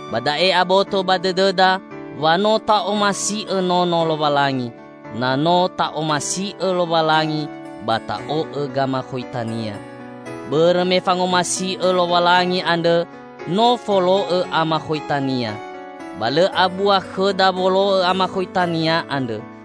Ba da'e aboto ba dõdõda wa no ta'omasi'õ nono Lowalangi, na no ta'omasi'õ Lowalangi ba ta'o'õ gamakhoita-Nia. Bõrõ me fangomasi'õ Lowalangi andrõ no folo'õ amakhoita-Nia. Ba lõ abua khõda wolo'õ amakhoita-Nia andrõ,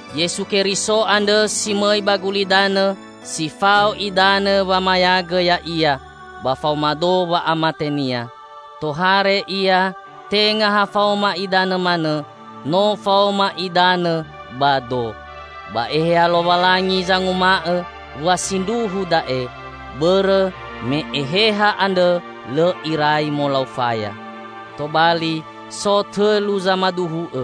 Yesu Keriso andrõ si mõi ba gulidanõ si fao idanõ wamayagõ Ya'ia ba faoma do wa'amate-Nia. Tohare Ia tenga ha faoma idanõ manõ, no faoma idanõ ba do. Ba Eheha Lowalangi zanguma'õ wa sindruhu da'e, bõrõ me Eheha andrõ lõ irai molau faya. Tobali, so tõlu zamaduhu'õ: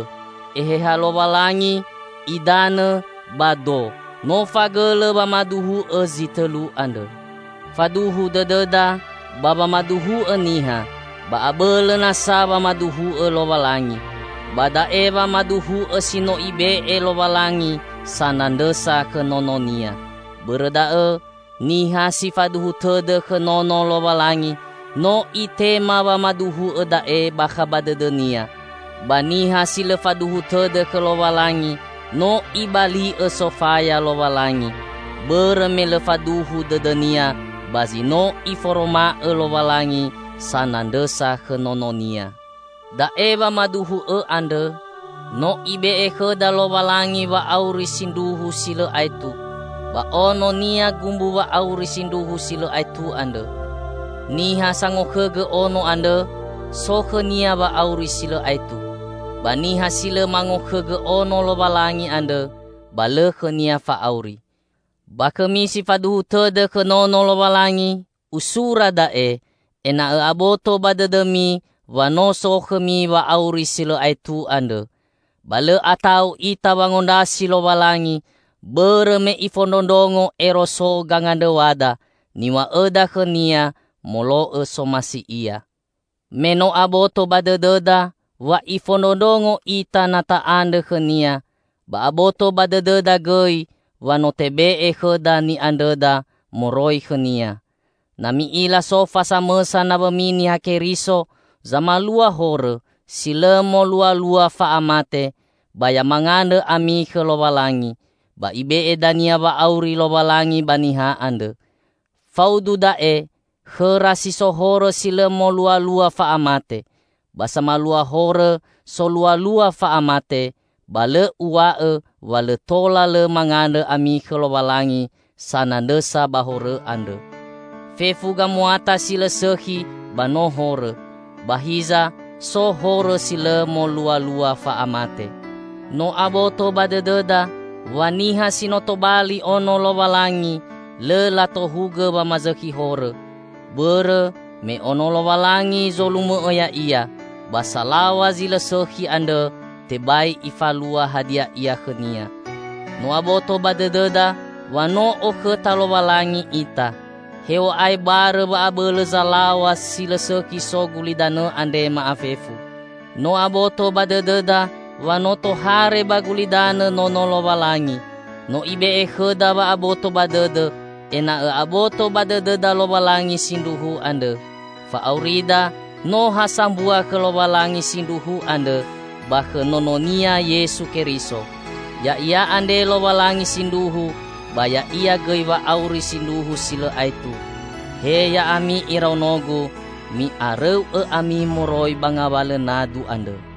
Eheha Lowalangi, idanõ ba do -- no fagõlõ wamaduhu'õ zi tõlu andrõ. Faduhu dõdõda ba wamaduhu'õ niha, ba abõlõ nasa wamaduhu'õ Lowalangi. Ba da'e wamaduhu'õ si no Ibe'e Lowalangi sanandrõsa khõ Nono-Nia. Bõrõ da'õ, niha si faduhu tõdõ khõ Nono Lowalangi, no itema wamaduhu'õ da'e bakha ba dõdõnia; ba niha si lõ faduhu tõdõ khõ Lowalangi, no ibali'õ sofaya Lowalangi, bõrõ me lõ faduhu dõdõnia ba zi no Iforoma'õ Lowalangi sanandrõsa khõ Nono-Nia. Da'e wamaduhu'õ andrõ: No Ibe'e khõda Lowalangi wa'auri sindruhu si lõ aetu, ba Ono-Nia gumbu wa'auri sindruhu si lõ aetu andrõ. Niha sangokhõgõ Ono andrõ, so khõnia wa'auri si lõ aetu; ba niha si lõ mangokhõgõ Ono Lowalangi andrõ, ba lõ khõnia fa'auri. Ba khõmi si faduhu tõdõ khõ Nono Lowalangi, usura da'e ena'õ aboto ba dõdõmi wa no so khõmi wa'auri si lõ aetu andrõ. Ba lõ ata'u ita wangondrasi Lowalangi, bõrõ me Ifondrondrongo ero so gangandrõw̃ada, niw̃a'õda khõ-Nia molo'õ somasi Ia. Me no aboto ba dõdõda wa Ifondrondrongo ita na ta'andrõ khõ-Nia, ba aboto ba dõdõda gõi wa no tebe'e khõda ni'andrõda moroi khõ-Nia. Na mi'ila so fa samõsa nawõmi Niha Keriso zamalua horõ si lõ molualua fa'amate, ba ya mangandrõ ami khõ Lowalangi; ba Ibe'e dania wa'auri Lowalangi ba niha andrõ. Faudu da'e khõra si so horõ si lõ molualua fa'amate. Ba samalua horõ solualua fa'amate, ba lõ uw̃a'õ wa lõ tola lõ mangandrõ ami khõ Lowalangi sanandrõsa ba horõ andrõ. Fefu gamuata si lõ sõkhi ba no horõ, ba hiza so horõ si lõ molualua fa'amate. No aboto ba dõdõda wa niha si no tobali Ono Lowalangi lõ latohugõ wamazõkhi horõ, bõrõ me Ono Lowalangi zolumõ'õ ya'ia, ba salaw̃a zi lõ sõkhi andrõ tebai ifalua hadia ia khõnia. No aboto ba dõdõda wa no okhõta Lowalangi ita, hew̃a'ae barõ wa'abõlõ zalaw̃a si lõ sõkhi so gulidanõ andre ma'afefu. No aboto ba dõdõda wa no tohare ba gulidanõ Nono Lowalangi. No Ibe'e khõda wa'aboto ba dõdõ, ena'õ aboto ba dõdõda Lowalangi Sindruhu andrõ. Fa'aurida no ha sambua khõ Lowalangi Sindruhu andrõ ba khõ Nono-Nia Yesu Keriso. Ya'ia andre Lowalangi Sindruhu, ba Ya'ia gõi wa'auri Sindruhu si lõ aetu. He ya'ami iraonogu, mi'arõu'õ ami moroi ba ngawalõ nadu andrõ!